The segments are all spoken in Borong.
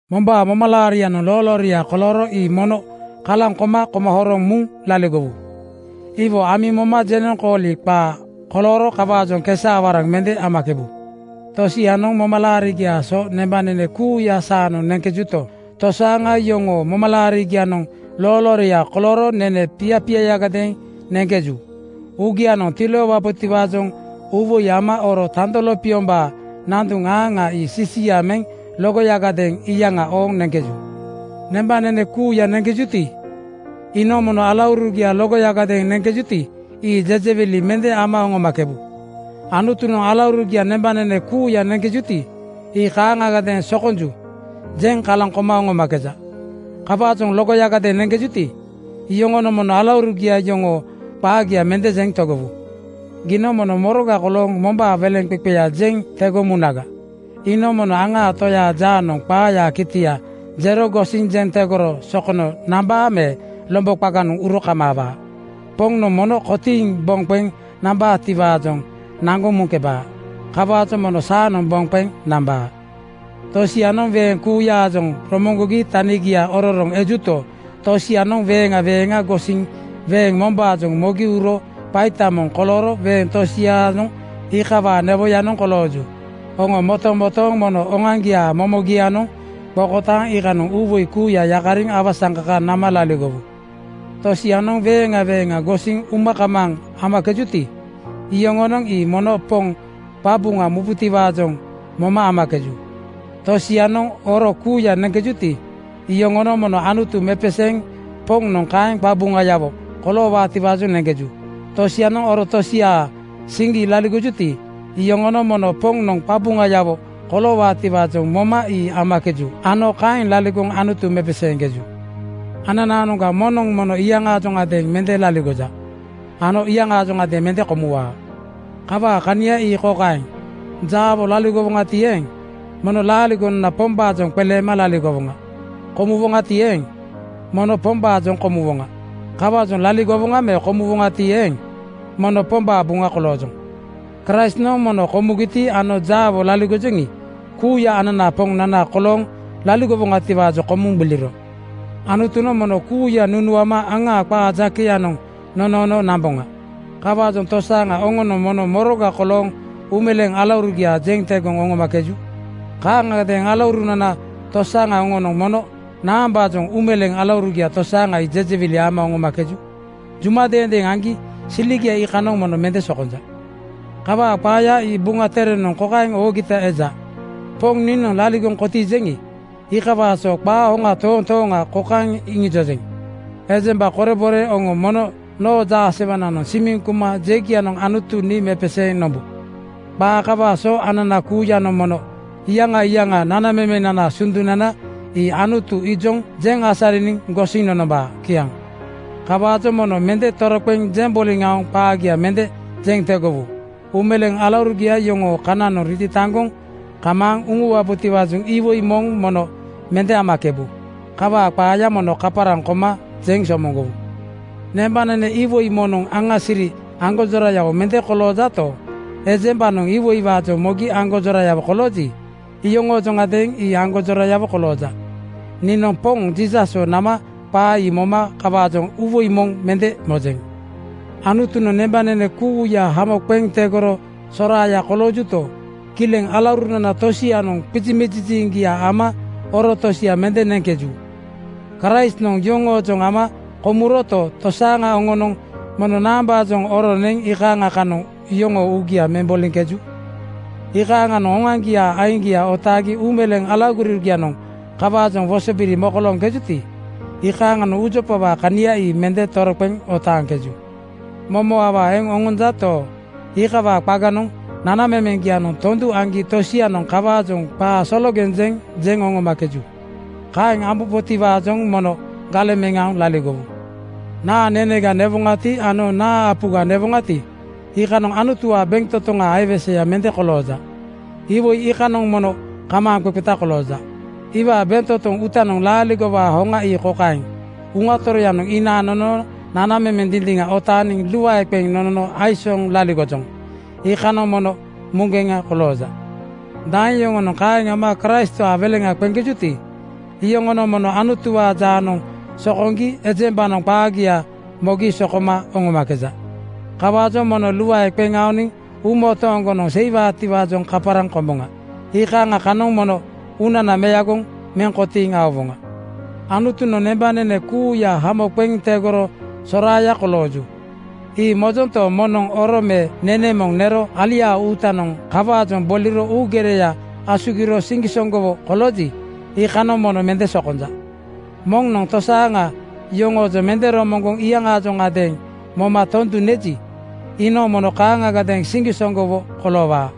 Mombaa momalaarianoŋ loolooria kolooro ii mono kalaŋ koma koma horoŋ muŋ laligowu. Iwo amiŋ moma jenoŋkooli qaa kolooro kawaajoŋ kesa-awaraŋ mende amakebu. Tosianoŋ momalaarigiaa so nembanene kuuya saanoŋ neŋkejuto, tosaaŋa yoŋoo momalaarigianoŋ loolooria kolooro nene piapiayagadeeŋ neŋkeju. Uugianoŋ tiloowabotiwaajoŋ uuwoi ama oro tando lopiombaa nanduŋ aaŋa ii sisia meŋ logoyagadeeŋ iyaŋa ooŋ neŋkeju. Nembanene kuuya neŋkejuti, iinoŋ mono alaurugia logoyagadeeŋ neŋkejuti, ii jejewili mende ama oŋomakebu. Anutunoŋ alaurugia nembanene kuuya neŋkejuti, ii kaaŋagadeeŋ “Sokonju,” jeŋ kalaŋ koma oŋomakeja. Kawaajoŋ logoyagadeeŋ neŋkejuti, oŋonoŋ mono alaurugia yoŋoo qaagia mende jeŋ tegowu. Giinoŋ mono moroga kolooŋ mombaa weleŋqeqeya jeŋ tegoŋ munaga? Iinoŋ mono aŋaa toyaa jaanoŋ qaayaa kitia jero gosiŋ jeŋ tegoro sokono nambaa me lombo qaganoŋ uro kamaawaa. Poŋnoŋ mono kotiiŋ boŋ qeŋ nambaatiwaajoŋ naŋgoŋ muŋkebaa. Kawaajoŋ mono saanoŋ boŋ qeŋ nambaa. Tosianoŋ weeŋ kuuyaajoŋ romoŋgogi tanigia ororoŋ ejuto, tosianoŋ weeŋa weeŋa gosiŋ weeŋ mombaajoŋ mogi uro qaita moŋ kolooro weeŋ tosianoŋ iikawaa newoyanoŋ kolooju. Oŋo motomotooŋ mono oŋoaŋgiaa momogianoŋ qokotaaŋ iikanoŋ uuwoi kuuya yakariŋ awasaŋkaka nama laligowu. Tosianoŋ weeŋa weeŋa gosiŋ uma kamaaŋ amakejuti, iyoŋonoŋ ii mono Poŋ qabuŋa mubaatiwaajoŋ moma amakeju. Tosianoŋ oro kuuya neŋkejuti, iyoŋonoŋ mono Anutu mepeseeŋ Poŋnoŋ kaeŋ qabuŋayawo koloowaatiwaajoŋ neŋkeju. Tosianoŋ oro tosiaa siŋgi laligoŋkejuti, iyoŋonoŋ mono Poŋnoŋ qabuŋayawo koloowaatiwaajoŋ moma ii amakeju ano kaeŋ laligoŋ Anutu mepeseeŋkeju. Ananaanoŋga moŋnoŋ mono iyaŋaajoŋadeeŋ mende laligoja ano iyaŋaajoŋadeeŋ mende komuwaa. Kawaa kania ii kokaeŋ: Jaawo laligowoŋati eeŋ, mono laaligonana Pombaajoŋ qeleema laligowoŋa. Komuwoŋati eeŋ, mono Pombaajoŋ komuwoŋa. Kawaajoŋ laligowoŋa me komuwoŋati eeŋ, mono Pombaa buŋa koloojoŋ. Kraistnoŋ mono komugiti ano jaawo laligojoŋi, kuuya ananaa Poŋnana kolooŋ laligowaatiwaajoŋ komuŋ gbiliro. Anutunoŋ mono kuuya nunuama aŋaa qaa jakeyanoŋ nonoono namboŋa. Kawaajoŋ tosaaŋa oŋonoŋ mono moroga kolooŋ uumeleeŋ alaurugia jeŋ tegoŋ oŋomakeju? Kaaŋagadeeŋ alauruna tosaaŋa oŋonoŋ mono naambaajoŋ uumeleeŋ alaurugia tosaaŋa ii jejewili ama oŋomakeju? Juma deendeeŋ aŋgi siligia iikanoŋ mono mende sokonja. Kawaa qaaya ii Buŋa Terenoŋ kokaeŋ oogita eja, “Poŋ niinoŋ laligoŋ kotiijeŋi, iikawaa so qaa hoŋa toontooŋa kokaeŋ iŋijojeŋ: Ejemba korebore oŋo mono noo jaasewananoŋ simiŋ kuma jegianoŋ Anutu nii mepeseeŋ nombu.” Qaa kawaa so anana kuuyanoŋ mono iyaŋa iyaŋa nanamemenanaa sundunana ii Anutu ijoŋ jeŋ asariniŋ gosiŋ nonombaa. Kiaŋ. Kawaajoŋ mono mende toroqeŋ jeŋ boliŋ aoŋ qaagia mende jeŋ tegowu. Uumeleeŋ alaurugia yoŋoo kananoŋ ritataŋgoŋ kamaaŋ uŋuwabotiwaajoŋ iwoi moŋ mono mende amakebu. Kawaa qaaya mono kaparaŋ koma jeŋ somoŋgowu. Nembanene iwoi moŋnoŋ aŋa siri aŋgonjorayawo mende koloojato, ejembanoŋ iwoiwaajoŋ mogi aŋgonjorayawo kolooji, iyoŋoojoŋadeeŋ ii aŋgonjorayawo kolooja. Niinoŋ Poŋ Jiisaswo nama qaa ii moma kawaajoŋ uuwoi moŋ mende mojeŋ. Anutunoŋ nembanene kuuya hamo qeŋ tegoro soraaya koloojuto, kileŋ alaurunana tosianoŋ qizimiziŋgia ama oro tosia mende neŋkeju. Kraistnoŋ yoŋoojoŋ ama komuroto, tosaaŋa oŋonoŋ mono naambaajoŋ oro neŋ iikaaŋa kanoŋ yoŋoo uugia meŋ boliŋkeju? Iikaaŋanoŋ oŋoaŋgiaa aiŋgia otaagi uumeleeŋ alaurugianoŋ kawaajoŋ wosobiri mokolooŋkejuti, iikaaŋanoŋ uujopawaa kana ii mende toroqeŋ otaaŋkeju. Momo awaa eŋ oŋonjato, iikawaa qaganoŋ nanamemeŋgianoŋ tondu aŋgi tosianoŋ kawaajoŋ qaa sologeŋ jeŋ jeŋ oŋomakeju. Kaeŋ ambubotiwaajoŋ mono galeŋ meŋ aoŋ laligowu. Naa nenega newoŋati ano naa apuga newoŋati, iikanoŋ Anutuwaa bentotoŋaa aiweseya mende kolooja. Iwoi iikanoŋ mono kamaaŋqeqeta kolooja. Iwaa bentotoŋ uutanoŋ laaligowaa hoŋa ii kokaeŋ: Uŋa Toroyanoŋ inaaŋ nonono nanamemeŋ dindiŋa otaaniŋ luae qeŋ nonono aisooŋ laligojoŋ. Iikanoŋ mono muŋgeŋa kolooja. Daeŋ yoŋonoŋ kaeŋ ama Kraistwaa weleŋ qeŋkejuti, iyoŋonoŋ mono Anutuwaa jaanoŋ sokoŋgi ejembanoŋ qaagia mogi sokoma oŋomakeja. Kawaajoŋ mono luae qeŋ aoniŋ uumotooŋgonoŋ seiwaatiwaajoŋ kaparaŋ komboŋa. Iikaaŋa kanoŋ mono uunana meagoŋ meŋ kotiiŋ aowoŋa. Anutunoŋ nembanene kuuya hamo qeŋ tegoro soraaya kolooju, ii mojonto, moŋnoŋ oro me nene moŋ nero aliaa uutanoŋ kawaajoŋ boliro uugereya asugiro siŋgisoŋgowo kolooji, iikanoŋ mono mende sokonja. Moŋnoŋ tosaaŋa yoŋoojoŋ mende romoŋgoŋ iyaŋaajoŋadeeŋ moma tondu neji, iinoŋ mono kaaŋagadeeŋ siŋgisoŋgowo koloowaa.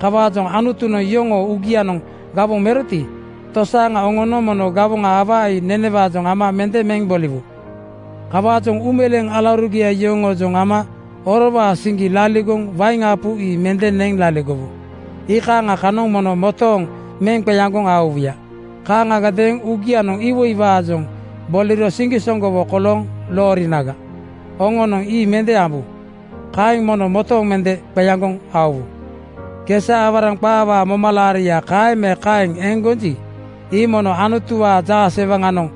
Kawaajoŋ Anutunoŋ yoŋoo uugianoŋ gawoŋ meroti, tosaaŋa oŋonoŋ mono gawoŋa awaa ii nenewaajoŋ ama mende meŋ boliwu. Kawaajoŋ uumeleeŋ alaurugia yoŋoojoŋ ama orowaa siŋgi laligoŋ wain apu ii mende neŋ laligowu. Iikaaŋa kanoŋ mono motooŋ meŋ qeaŋgoŋ aowuya. Kaaŋagadeeŋ uugianoŋ iwoiwaajoŋ boliro siŋgisoŋgowo kolooŋ loorinaga, oŋonoŋ ii mende ambu. Kaeŋ mono motooŋ meŋ qeaŋgoŋ aowu. Kesa-awaraŋ qaawaa momalaaria kaeŋ me kaeŋ eŋ gonji, ii mono Anutuwaa jaasewaŋanoŋ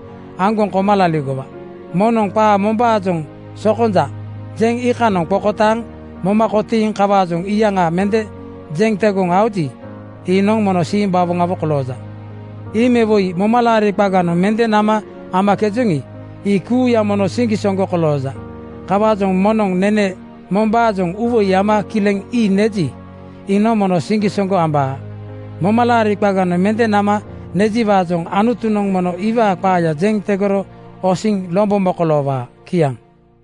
aŋgoŋ koma laligowa. Moŋnoŋ qaa mombaajoŋ “sokonja,” jeŋ iikanoŋ qokotaaŋ moma kotiiŋ kawaajoŋ iyaŋa mende jeŋ tegoŋ aoji, iinoŋ mono simbawoŋawo kolooja. Ii me woi momalaari qaganoŋ mende nama amakejoŋi, ii kuuya mono siŋgisoŋgo kolooja. Kawaajoŋ moŋnoŋ nene mombaajoŋ uuwoi ama kileŋ ii neji, iinoŋ mono siŋgisoŋgo ambaa. Momalaari qaganoŋ mende nama nejiwaajoŋ Anutunoŋ mono iwaa qaaya jeŋ tegoro osiŋ lombo mokoloowaa. Kiaŋ.